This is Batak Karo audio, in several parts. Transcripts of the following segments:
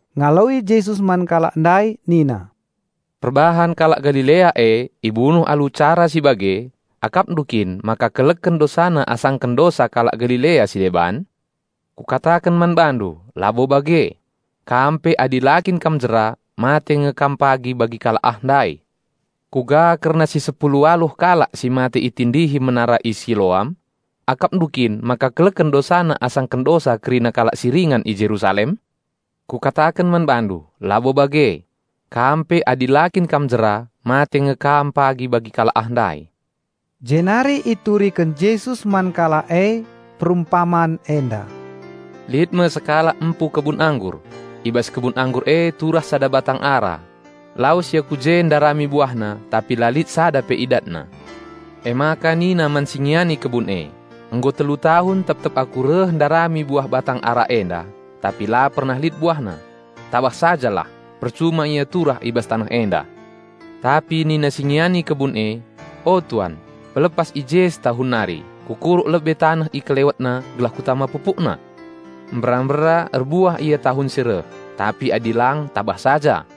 Ngaloi Jesus man kalak ndai nina, "Perbahan kalak Galilea e ibunuh alu cara si bage, akapndu kin maka keleken dosana asaken dosa kalak Galilea si deban? Kukataken man bandu, labo bage! Kam pe adi la kin kam jera, mate nge kam pagi bagi kalak ah ndai. Kuga kerna si sepulu waluh kalak si mate itindihi menara i Siloam? Akapndu kin maka keleken dosana asaken dosa kerina kalak si ringan i Jerusalem? Kukataken man bandu, labo bage! Kam pe adi la kin kam jera, mate nge kam pagi bagi kalak ah ndai." Jenari ituriken Jesus man kalak e perumpaman enda, "Lit me sekalak empu kebun anggur; i bas kebun anggur e turah sada batang ara. Lawes ia ku je ndarami buahna tapi la lit sada pe idatna. Emaka nina man si ngiani kebun e, 'Nggo telu tahun tep-tep aku reh ndarami buah batang ara enda, tapi la pernah lit buahna. Tabah sajalah! Percuma ia turah i bas taneh enda.' Tapi nina si ngiani kebun e, 'O Tuan, pelepas i je setahun nari; kukuruk lebe taneh i kelewetna gelah kutama pupukna. Mbera-mbera erbuah ia tahun si reh; tapi adi lang tabah saja.'"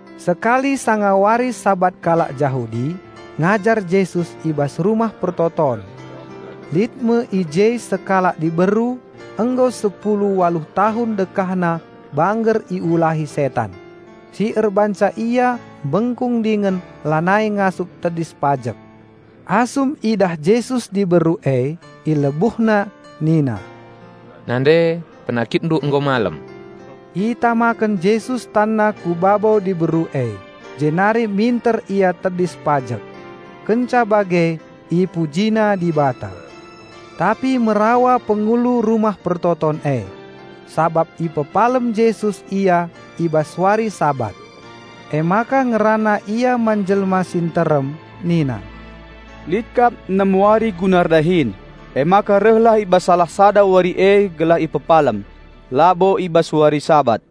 Sekali sanga wari Sabat kalak Jahudi ngajar Jesus i bas rumah persembahen. Lit me i je sekalak diberu nggo sepulu waluh tahun dekahna bangger iulahi setan, si erbahanca ia mbengkung dingen lanai ngasup tedis pajek. Asum idah Jesus diberu e, IlebuhNa Nina "Nande, penakitndu nggo malem!" Itamaken Jesus TanNa ku babo diberu e jenari minter ia tedis pajek. Kenca bage ipujina Dibata. Tapi merawa pengulu rumah persembahen e, sabap ipepalem Jesus ia i bas wari Sabat. Emaka ngerana ia man jelma si nterem nina, "Lit kap enem wari guna erdahin; emaka rehlah i bas salah sada wari e gelah ipepalem, labo i bas wari Sabat."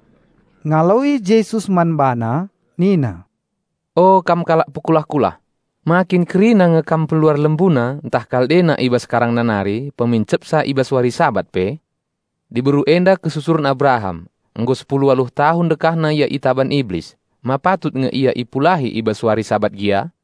Ngaloi Jesus man bana nina, "O kam kalak pekulah-kulah! Ma kin kerina nge kam peluar lembuna ntah kaldena i bas karangna nari pemincepsa i bas wari Sabat pe? Diberu enda kesusuren Abraham; nggo sepulu waluh tahun dekahna ia itaban Iblis; ma patut nge ia ipulahi i bas wari Sabat gia?"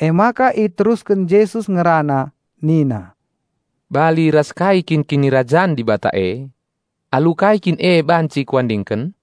Emaka iterusken Jesus ngerana nina, "Bali ras kai kin Kinirajan Dibata e? Alu kai kin e banci Kuandingken?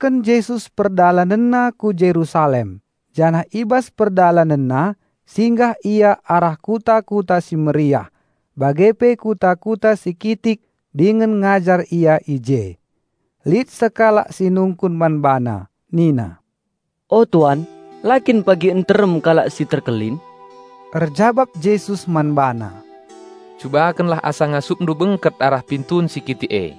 Iterusken Jesus PerdalanenNa ku Jerusalem janah i bas PerdalanenNa singgah Ia arah kuta-kuta si meriah bage pe kuta-kuta si kitik dingen ngajar Ia i je. Lit sekalak si nungkun man BaNa nina, "O Tuan, la kin pagi nterem kalak si terkelin?" Erjabap Jesus man bana, "Cubakenlah asa ngasupndu bengket arah pintun si kitik e;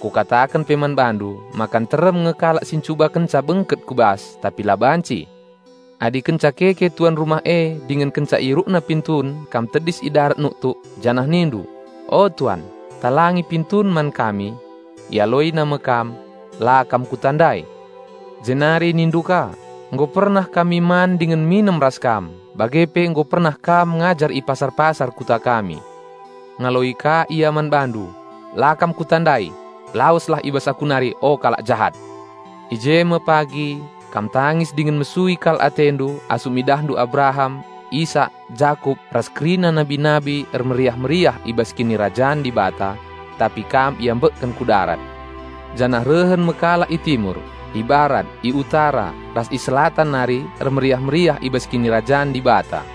Kukataken pe man bandu maka nterem nge kalak si ncubakenca bengket ku bas tapi la banci. Adi kenca keke tuan rumah e dingen kenca ierukna pintun kam tedis i darat nuktuk, janah nindu, 'O, Tuan, talangi pintun man kami!', ialoina me kam, 'La kam kutandai!' Jenari nindu ka, 'Nggo pernah kami man dingen minem ras kam, bage pe nggo pernah Kam ngajar i pasar-pasar kuta kami.' Ngaloi ka ia man bandu, 'La kam kutandai! Laweslah i bas Aku nari o kalak jahat!' I je me pagi kam tangis dingen mesui kal atendu asum idahndu Abraham, Isak, Jakup ras kerina nabi-nabi ermeriah-meriah i bas Kinirajan Dibata, tapi kam iambekken ku darat. Janah rehen me kalak i Timur, i Barat, i Utara, ras i Selatan nari ermeriah-meriah i bas Kinirajan Dibata.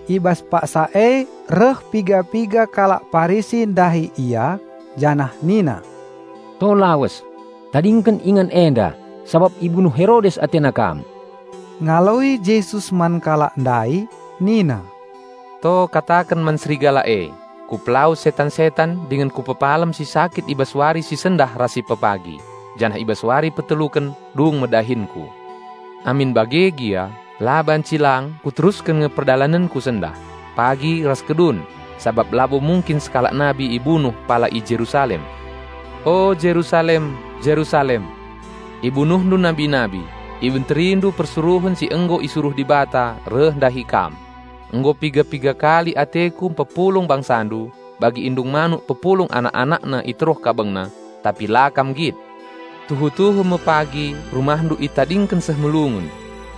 I bas paksa e reh piga-piga kalak Parisi ndahi Ia, janah nina, "To lawes, tadingken ingan enda sabap ibunuh Herodes atena Kam." Ngaloi Jesus man kalak ndai nina, "To kataken man serigala e, 'Kupelawes setan-setan dingen Kupepalem si sakit i bas wari si sendah ras si pe pagi, janah i bas wari peteluken dung me dahinKu.' Amin bage gia, la banci lang kuterusken nge perdalanenKu sendah, pagi ras kedun; sabap labo mungkin sekalak nabi ibunuh pala i Jerusalem. O Jerusalem, Jerusalem! Ibunuhndu nabi-nabi, ibenterindu persuruhen si nggo isuruh Dibata reh ndahi kam! Nggo piga-piga kali ateKu mpepulung bangsandu, bagi indung manuk pepulung anak-anakna i teruh kabengna, tapi la kam nggit! Tuhu-tuhu me pagi rumahndu itadingken seh melungun.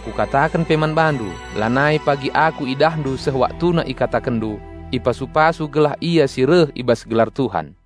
Kukataken pe man bandu, lanai pagi Aku idahndu seh waktuna ikatakenndu, 'Ipasu-pasu gelah Ia si reh i bas gelar Tuhan.'"